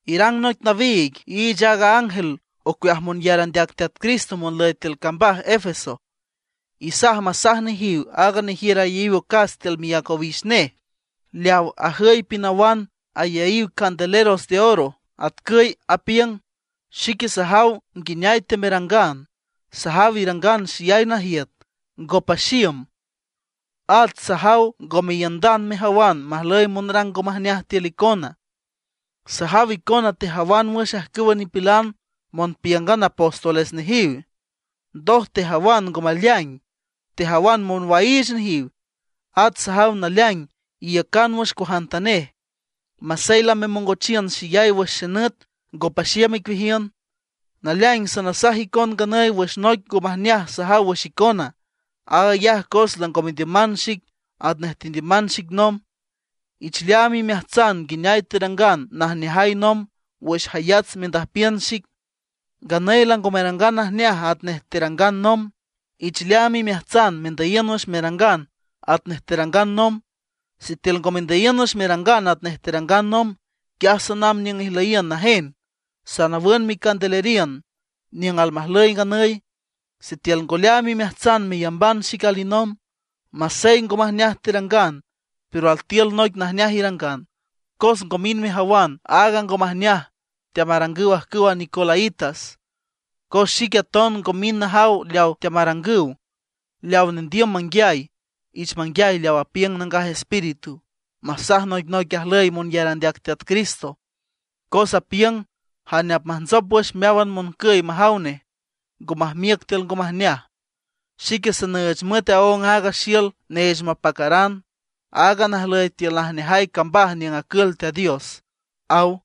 ’Irang noic nawiig, iich aaga ángel ocueaj monyar andeac Teat Cristo monlüy tiül cambaj Efeso. Isaj masaj nejiw aaga nejiür ayaíw ocas tiül miác owix nej, leaw ajüy pinawan ayaíw candeleros de oro, atcüy apiüng: “Xique sajaw nguineay teamerangan; sajaw irangan xeyay najiüt, ngo paxiüm. At sajaw ngome iiündan mejawan majlüy monrang ngo majneaj tiül icona. Sajaw icona tejawan wüx ajcüwa nipilan monpíüngan apóstoles nejiw, ndoj tejawan ngo maleaing, tejawan monwaiich nejiw. At sajaw naleaing iiücan wüx cuajantanej, masey lamemongochiün xeyay wüx xenüt, ngo paxiüm icueajiün. Naleaing sanasaj icon nganüy wüx noic ngo majneaj sajaw wüx icona. Aag ayaj cos lango mendiüman xic atnej tendiüman xic nomb. Ich leaam imeajtsan nguineay terangan najneajay nomb wüx jayats mendüjpiün xic. Nganüy lango merangan najneaj atnej terangan nomb. Ich leaam imeajtsan mendüyiün wüx merangan atnej terangan nomb. Sitiül ngo mendüyiün wüx merangan atnej terangan nomb, quiaj sanamb niüng ijlüyiün najen. Sanawün micandeleriün niüng almajlüy nganüy, sitiül ngo leaam imeajtsan meyamban xic alinomb. Masey ngo majneaj terangan, pero altiül noic najneaj irangan, cos ngo mind mejawan aaga ngo majneaj teamarangüw qjcüwa nicolaítas, cos xique aton ngo mind najaw leaw teamarangüw. Leaw nendiüm manguiay, ich manguiay leaw apiüng Nangaj Espíritu, masaj noicnoic ajlüy monyar andeac Teat Cristo. Cos apiüng: Jane apmajntsop wüx meáwan moncüy majaw nej, ngo majmiüc tiül ngo majneaj, xique sanüüch müet aóng aaga xiül neech mapacaran, aaga najlüy tiül najneajay cambaj niüng acül Teat Dios”, aw.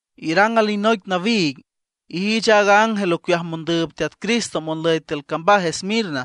’Irang alinoic nawiig, iich aaga ángel ocueaj mondüüb Teat Cristo monlüy tiül cambaj Esmirna.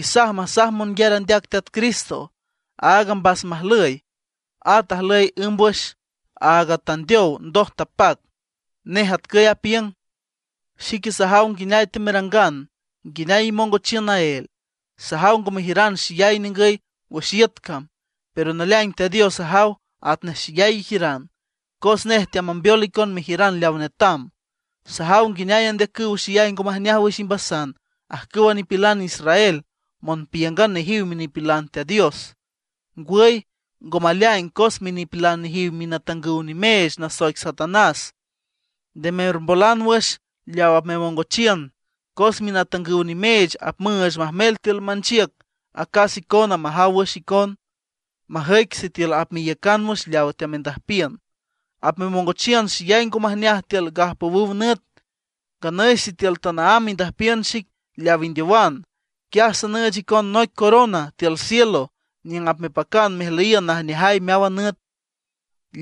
Isaj masaj monyar andeac Teat Cristo, áaga mbas majlüy, at ajlüy ǘmbwüx, aaga tandeow ndoj tapac. Nej atcüy apiüng: “Xique sajaw nguineay teamerangan, nguineay imongochiün naél. Sajaw ngo mejiüran xeyay ningüy wüx iüt cam, pero naleaing Teat Dios ajaw atnej xeyay ijiüran, cos nej teamambeol icon mejiüran leaw netam. Sajaw nguineay andeacüw xeyay ngo majneaj wüx imbasan ajcüwa nipilan israel monpíüngan nejiw minipilan Teat Dios. Ngwüy, ngo maleaing cos minipilan nejiw minatangüw nimeech nasoic Satanás. Nde mermbolan wüx leaw apmemongochiün, cos minatangüw nimeech apmüüch majmel tiül manchiüc acas icona majaw wüx icon, majüic sitiül apmeiücan wüx leawa teamendüjpiün. Apmemongochiün xeyay ngo majneaj tiül gajpowüw nüt. Nganüy sitiül tanaámb indüjpiün xic leaw indeowan, quiaj sanüüch icon noic corona tiül cielo niüng apmepacan mejlüyiün najneajay meáwan nüt.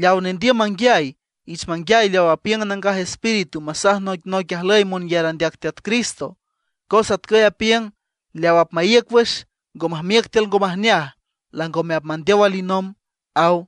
Leaw nendiüm manguiay, ich manguiay leaw apiüng Nangaj Espíritu masaj noicnoic ajlüy monyar andeac Teat Cristo. Cos atcüy apiüng: Leaw apmaíüc wüx, ngo majmiüc tiül ngo majneaj, langome apmandeow alinomb”, aw.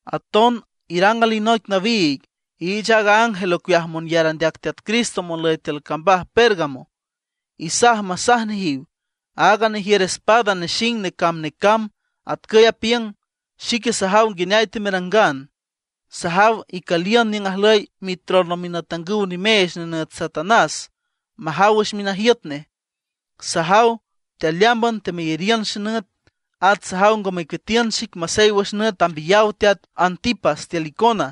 ’Aton irang alinoic nawiig, iich aaga ángel ocueaj monyar andeac Teat Cristo monlüy tiül cambaj Pérgamo. Isaj masaj nejiw: Aaga nejiür espada nexing necamb necamb, atcüy apiüng: “Xique sajaw nguineay teamerangan. Sajaw icüliün niüng ajlüy mitrono minatangüw nimeech nenüt Satanás, majaw wüx minajiüt nej. Sajaw tealeámban temeyariün xenüt. At sajaw ngo mecueatiün xic masey wüx nüt tambiyaw teat Antipas tiül icona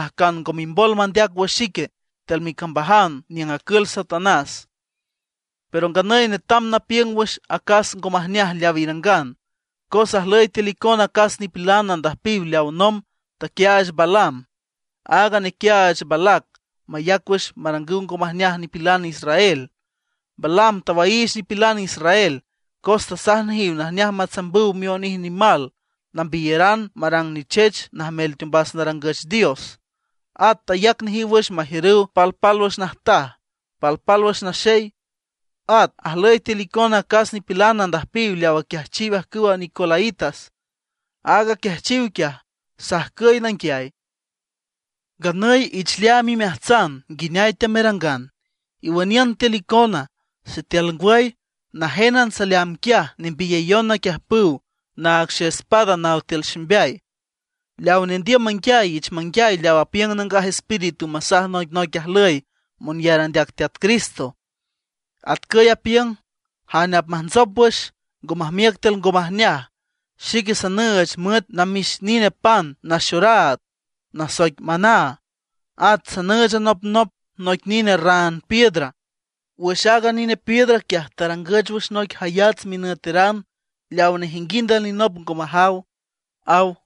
ajcan ngo mimbol mandeac wüx xique tiül micambajan niüng acül Satanás. Pero nganüy netam napiüng wüx acas ngo majneaj leaw irangan: Cos ajlüy tiül icona acas nipilan andüjpiw leaw nomb taquiaach Balaam, aaga nequiaach Balac mayac wüx marangüw ngo majneaj nipilan israel. Balaam tawaiich nipilan israel, cos tasaj nejiw najneaj matsambüw mionij nimal nambiyeran marang nichech najmel teombas narangüch dios. At tayac nejiw wüx majiürüw palpálwüx najtaj, palpálwüx naxey. At ajlüy tiül icona acas nipilan andüjpiw leaw aquiajchiw ajcüwa nicolaítas. Aaga aquiajchiw quiaj sajcüy nanguiay. Nganüy ich leaam imeajtsan nguineay teamerangan, iwüniün tiül icona. Sitiül ngwüy, najénan saleamb quiaj nembiyayon naquiüjpüw naag xaespada naw tiül ximbeay. Leaw nendiüm manguiay ich manguiay leaw apiüng Nangaj Espíritu masaj noicnoic ajlüy monyar andeac Teat Cristo. Atcüy apiüng: Jane apmajntsop wüx, ngo majmiüc tiül ngo majneaj, xique sanüüch müet namix nine pan naxoraad, nasoic maná. At sanüüch anopnop noic nine raan piedra. Wüx aaga nine piedra quiaj tarangüch wüx noic jayats minüteran leaw nejinguind alinop ngo majaw”, aw.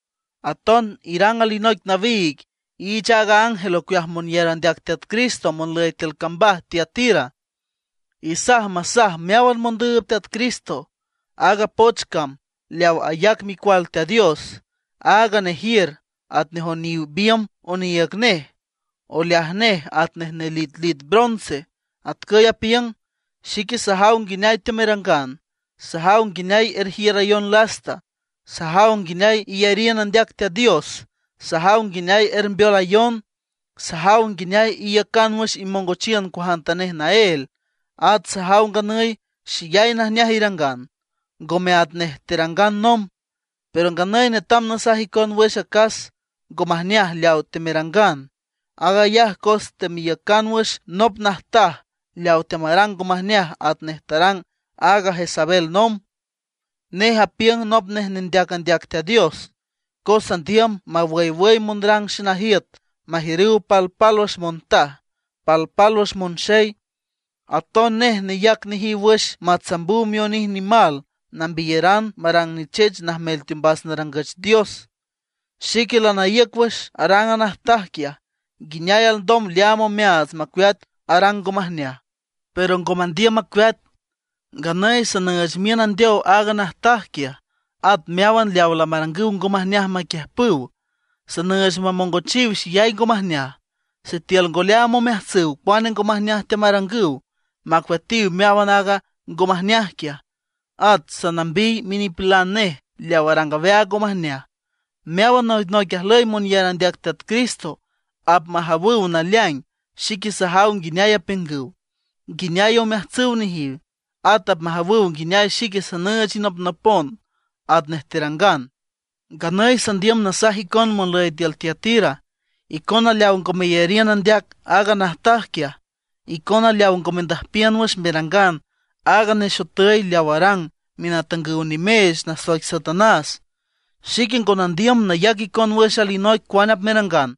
’Aton irang alinoic nawiig, iich aaga ángel ocueaj monyar andeac Teat Cristo monlüy tiül cambaj Tiatira. Isaj masaj meáwan mondüüb Teat Cristo aaga poch cam leaw ayac Micual Teat Dios, aaga nejiür atnej oniw biümb oniiüg nej, oleaj nej atnej nelitlit bronce. Atcüy apiüng: “Xique sajaw nguineay teamerangan; sajaw nguineay erjiürayon lasta; sajaw nguineay iyariün andeac Teat Dios; sajaw nguineay ermbeolayon; sajaw nguineay iiücan wüx imongochiün cuajantanej naél; at sajaw nganüy xeyay najneaj irangan, ngome atnej terangan nomb. Pero nganüy netam nasaj icon wüx acas ngo majneaj leawa temerangan. Aag ayaj cos teameiücan wüx nop najtaj leaw teamarang ngo majneaj atnej tarang aaga Jezabel nomb. Nej apiüng nop nej nendeac andeac Teat Dios, cos andiüm mawüywüy monrang xenajiüt majiürüw palpálwüx montaj, palpálwüx monxey. Aton nej neyac nejiw wüx matsambüw mionij nimal nambiyeran marang nichech najmel teombas narangüch dioses. Xique lanaíüc wüx arang a najtaj quiaj, nguineay alndom leaam omeaats macueat arang ngo majneaj, pero ngo mandiüm macueat. Nganüy sanüüch miün andeow aaga najtaj quiaj. At meáwan leaw lamarangüw ngo majneaj maquiüjpüw, sanüüch mamongochiw xeyay ngo majneaj, sitiül ngo leaam omeajtsüw cuane ngo majneaj teamarangüw, macueatiw meáwan aaga ngo majneaj quiaj. At sanambiy minipilan nej leaw arang aweaag ngo majneaj. Meáwan noicnoic ajlüy monyar andeac Teat Cristo apmajawüw naleaing xique sajaw nguineay apiüngüw, nguineay omeajtsüw nejiw. At apmajawüw nguineay xique sanüüch inopnopon atnej terangan. Nganüy sandiüm nasaj icon monlüy tiül Tiatira, icona leaw ngo meyariün andeac aaga najtaj quiaj, icona leaw ngo mendüjpiün wüx merangan aaga nexotüy leaw arang minatangüw nimeech nasoic Satanás; xique ngo nandiüm nayac icon wüx alinoic cuane apmerangan.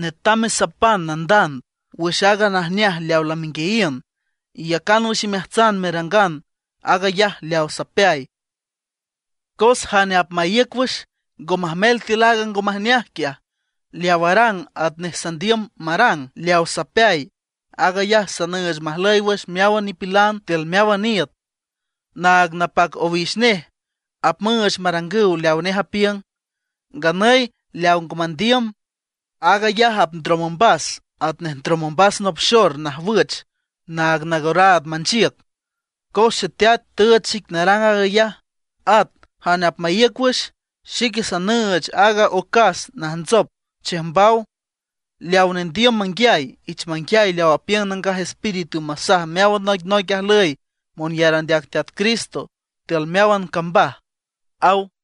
Netam mesapan nandand wüx aaga najneaj leaw lamenguiayiün, iyacan wüx imeajtsan merangan aag ayaj leaw sapeay. Cos jane apmaíüc wüx, ngo majmel tiül aaga ngo majneaj quiaj, leaw arang atnej sandiüm marang leaw sapeay; aag ayaj sanüüch majlüy wüx meáwan nipilan tiül meáwan iüt. Naag napac owix nej apmüüch marangüw leawa nej apiüng. Nganüy leaw ngo mandiüm, aag ayaj apndrom ombas atnej ndrom ombas nop xor najwüch naag nangoraad manchiüc. Cos Xeteat tüüch xic narang aag ayaj. At jane apmaíüc wüx, xique sanüüch aaga ocas najntsop chiüjmbaw. Leawa nendiüm manguiay, ich manguiay leaw apiüng Nangaj Espíritu masaj meáwan noicnoic ajlüy monyar andeac Teat Cristo tiül meáwan cambaj”, aw.